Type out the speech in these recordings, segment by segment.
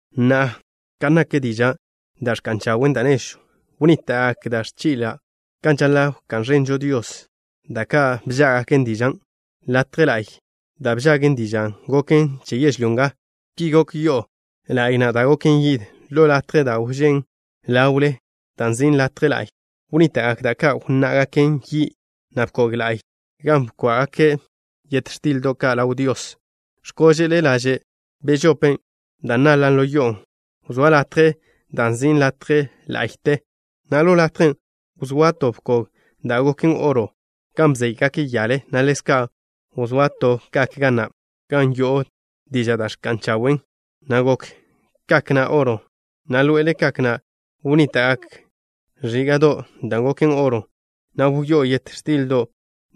Na'a, kan nak dižan' da' ẕka'n chawe' da' nežwn', wnníta'gak da' ẕchi'l ka' kan žaḻa' wká'n ẕenžo Dios, da' ka' bžággaken dižan'. Latje la'y, da' bžagen dižan', goken che yežlyó nga. Ki gok yo'o la'y na' da' goken yid. Ḻo latjen' da' wžén' ḻawle, dan' nzin' latje la'y, wnníta'gak da' ka' nwá'gaken yi', na' bkog la'y gan bkwá'gake' yet x̱tildo' ka' ḻaw Dios. X̱kóže'le laže' bežope dan' naḻan' ḻo yo'on', wzóa latjen' da' nzin' latje ḻa'yte, na' ḻo latjen' wzóa to bkog da' goken oro gan bzéygake' yale, na' ḻezka' wzóa to kak ga na', gan wyó'o dižan' da' ẕka'n chawen', na' gokw kak na' oro, na' ḻoe'ele kak na' wnníta'gak ẕíga'don' da' goken oro, gan wyó'o yet x̱tildo'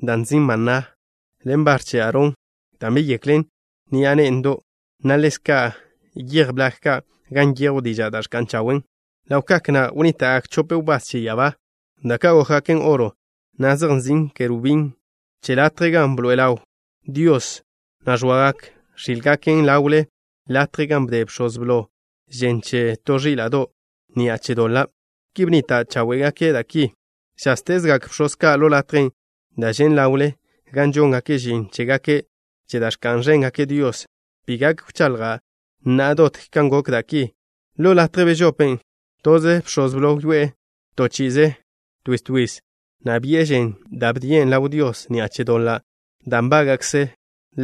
da' nzin' maná, ḻen bar che Aarón, dan' beyeklen ni'a ne'ndo', na' ḻezka' yej blag ka', gan nyejw dižan' da' ẕka'n chawen'. Ḻaw kak na' wnníta'gak chope wbás che ya'abá ka', da' ka' gókgaken oro, na' zej nzin' kerubín che latje gan bḻoe'e ḻaw Dios, na' ẕoagak x̱ílgaken ḻawle latje gan bde bx̱oz blo žen che to ẕíla'do' ni'a che doḻa'. Ki bnnita' cháwe'gake' da' ki. Žáztezgak bx̱oz ka' ḻo latjen' da' žen' ḻawle, gan žóngake' žin chégake' che da' ẕka'n ẕéngake' Dios. Bi gak wchaḻja' na'a dot kan gokgak da' ki. Ḻo latje bežopen', toze bx̱oz blo wyoé'e toze chi'i twiz twiz, na' bi'e žen, da' bdien' ḻaw Dios ni'a che doḻa' da' nbága'kze'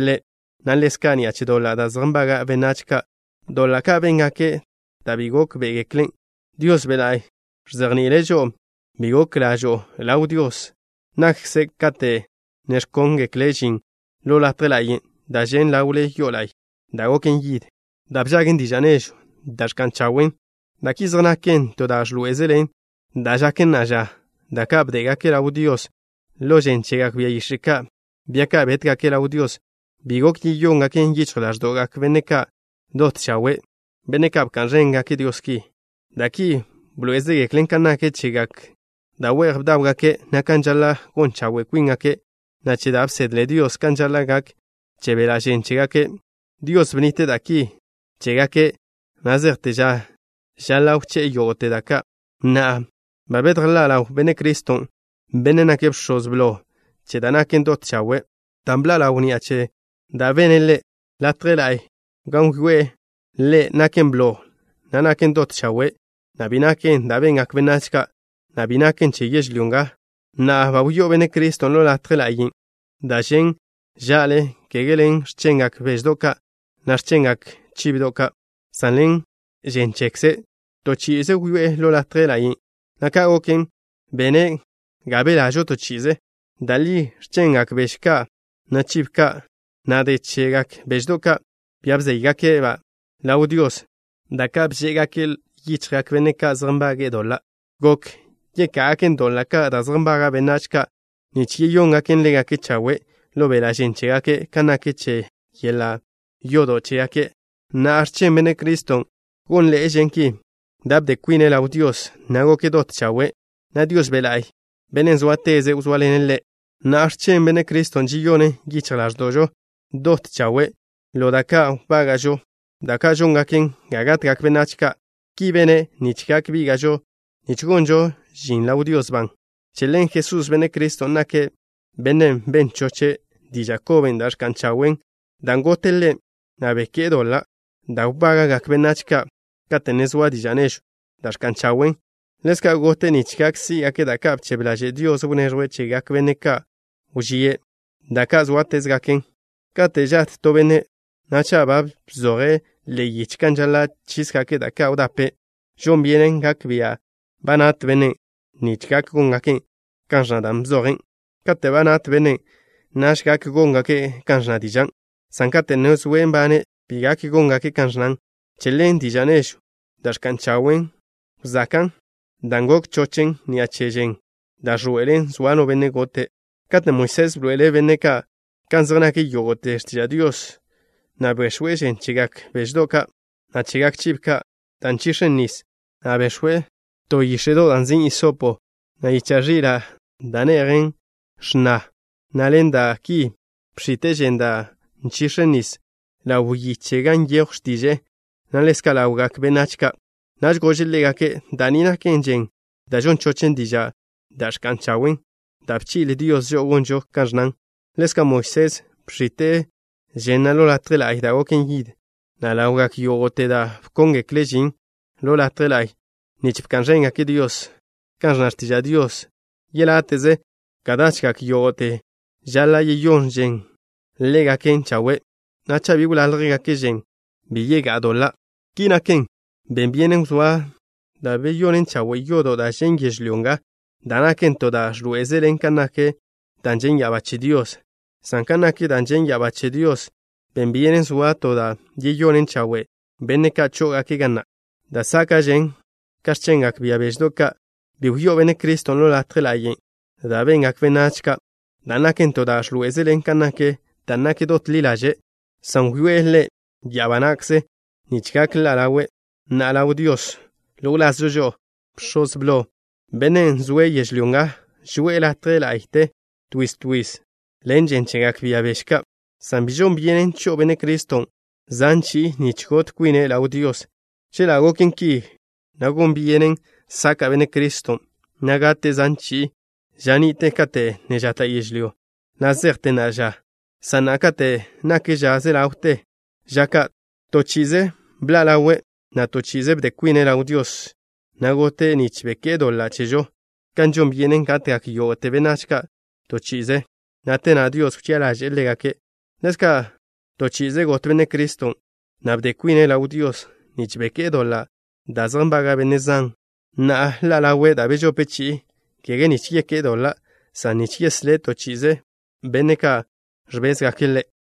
ḻe', na' ḻezka' ni'a che doḻa' da' zej nbaga' benách ka', doḻa' ka' béngake' da' bi gókbe'egeklen'. Dios Be' La'y ẕzejni'ile' žo'o bi gok ḻa'žo ḻaw Dios na'kze kate' ne ẕkóngekle' žin ḻo latje ḻa'yen' da' žen' ḻawle ḻo yo'o la'y da' goken yid, da' bžagen diža' nežwn' da' ẕka'n chawen'. Da' ki zej naken to da' ẕḻoé'ezelen da' žaken na'a ža. Da' ka' bdégake' ḻaw Dios ḻen žen chegak bia yix̱e' ka', bia ka' bétgake' ḻaw Dios, bi gok yeyóngaken yichj ḻáẕdo'gak benne' ka' dot chawe', benne' ka' bka'n ẕéngake' Dios ki. Da' ki bḻoé'ezegeklen kan nak chegak da' we'j bdáwgake', na' kan žaḻa' gon chawe' kwíngake', na' che da' bsedle Dios kan žaḻa' gak che beḻa' žen chégake'. Dios bnnite' da' ki chégake' na' zejte ža žaḻa' wché'e yógo'te da' ka'. Na'a, ba bedjḻá' ḻaw Benne' Criston', Bennen' nake' Bx̱oz Blo che da' naken dot chawe', dan' bḻa' ḻawn ni'a che da' bene' Ḻe'. Latje La'y gan wyoé'e Ḻe' naken blo, na' naken dot chawe', na' bi naken da' bengak benách ka', na' bi naken che yežlyó nga. Na'a, ba wyó'o Benne' Criston' ḻo Latje Ḻa'yen', da' žen' ža'le, kege ḻen x̱chengak beždo' ka', na' x̱chengak chibo ka', san ḻen žen chekze'. Toze chi'i wyoé'e ḻo Latje Ḻa'yten', na' ka' goken, bene' ga belažo to chi'ize. Da' li, x̱chengak beže ka', na' chibo ka', na' de chegak beždo' ka', bia bzéygake'-ba' ḻaw Dios, da' ka' bchébgake' ḻo yichjgak benne' ka' zej nbage'e doḻa', gok yeká'gaken doḻa' ka' da' zej nbaga' benách ka' nich yeyóngaken ḻégake' chawe' ḻo beḻa' žen chégake' kan nak che yeḻa' yodo' chégake'. Na'a, x̱chen Benne' Criston' gónḻe'ežen ki, dan' bde kwine' ḻaw Dios, na' goke' dot chawe', na' Dios Be' La'y, Bennen' zóateze', wzóaḻene' Ḻe'. Na'a, x̱chen Benne' Criston' žeyonen yichj ḻáẕdo'žo dot chawe' ḻo da' ka' wbága'žo, da' ka' žóngaken ga gatgak benách ka'. Ki bene' nich gak bíga'žo nich gonžo žin ḻaw Dios ban. Che ḻen Jesús, Benne' Criston', nake' Bennen' ben choche' diža' koben' da' ẕka'n chawe', dan' gote' Ḻe', na' beké'e doḻa' da' wbága'gak benách ka' kate' ne zoa diža' nežwn' da' ẕka'n chawen'. Ḻezka' gote' nich gak sí'gake' da' ka' bchebe ḻaže' Dios wneẕjwe' chegak benne' ka' wžíe', da' ka' zóatezgaken. Kate' žat to benne', na' cha' ba bzoje' ḻe'e yiche kan žaḻa' chísgake' da' ka' wdape', žon byenen gak bia' ba nat bennen' nich gak góngake' kan ẕnna dan' bzojen'. Kate' ba nat bennen', naž gak góngake' kan ẕnna dižan', san kate' ne zoe' nbane', bi gak góngake' kan ẕnnan. Che ḻen, diža' nežwn' da' ẕka'n chawen' wzakan' dan' gok chochen ni'a che žen, da' ẕḻoe'elen zoa no benne' gote'. Katen' Moisés bḻoe'ele' benne' ka' kan zej nak yógo'te x̱tiža' Dios, na' bex̱we' žen chegak beždo' ka', na' chegak chibo ka', dan' nchix̱en nis, na' bex̱we' to yíx̱e'do' da' nzin' hisopo, na' yicha' ẕila' da' ne'jen x̱na, na' ḻen da' ki bx̱ite' žen dan' nchix̱en nisen' ḻaw yiche gan nyejw x̱tiže'e, na' ḻezka' ḻawgak benách ka'. Naž gože' ḻégake': “Da' ni naken žen da' žon chochen dižan' da' ẕka'n chawe' da' bchi'le Dios žo'o gonžo kan ẕnnan.” Ḻezka' Moisés bx̱ite' žen na' ḻo latje la'y da' goken yid, na' ḻawgak yógo'te da' bkóngekle' žin ḻo latje la'y nich bka'n ẕéngake' Dios. Kan ẕnna x̱tiža' Dios, yeláte'ze ka dachgak yógo'te žaḻa' yeyón žen ḻégaken chawe', na' cha' bi wláljgake' žen, bi yegá'a doḻa'. Ki naken, ben byenen wzóa da' beyonen chawe' yodo' da' žen' yežlyó nga da' naken to da' ẕḻoé'ezelen kan nak dan' žen' ya'abá che Dios, san kan nak dan' žen' ya'abá che Dios, ben byenen soa to da' yeyonen chawe' benne' ka' chó'ogake' ga na', dan' záka'žen ka x̱chengak bia beždo' ka'. Bi wyó'o Benne' Criston' ḻo latje ḻa'yen' da' bengak benách ka', dan' naken to da' ẕḻoé'ezelen kan nak dan' naken dot ḻi ḻaže', san wyoé'e Ḻe' ya'abá na'kze nich gak ḻa' ḻawe' na'a ḻaw Dios ḻo wlazžo žo'o. Bx̱oz blo, bennen' zoe' yežlyó nga, žoe'e latje ḻa'yte twiz twiz ḻen žen chegak bia beže ka', san bi žon byenen cho'o Benne' Criston' zan chi'i nich got kwine' ḻaw Dios. Chela' goken ki, na' gon byenen saka' Benne' Criston', na' gate' zan chi'i ža ni'te kate' ne žata' yežlyó, na' zejte na'a ža, san na'a, kate' nak ža ze ḻawte ža ka', toze chi'i bḻa' ḻawe', na' to chi'ize bde kwine' ḻaw Dios, na' gote' nich beké'e doḻa' chežo. Kan žon byenen gatgak yógo'te benách ka' toze chi'i, na' te na' Dios wchi'a ḻaže'e ḻégake', ḻezka', toze chi'i got Benne' Criston', na' bde kwine' ḻaw Dios nich beké'e doḻa' da' zej nbaga' benne' zan. Na'a, ḻa' ḻawe' da' bežope chi'i, kege nich yeké'e doḻa', san nich yeslé' to chi'ize benne' ka' ẕbézgake' Ḻe'.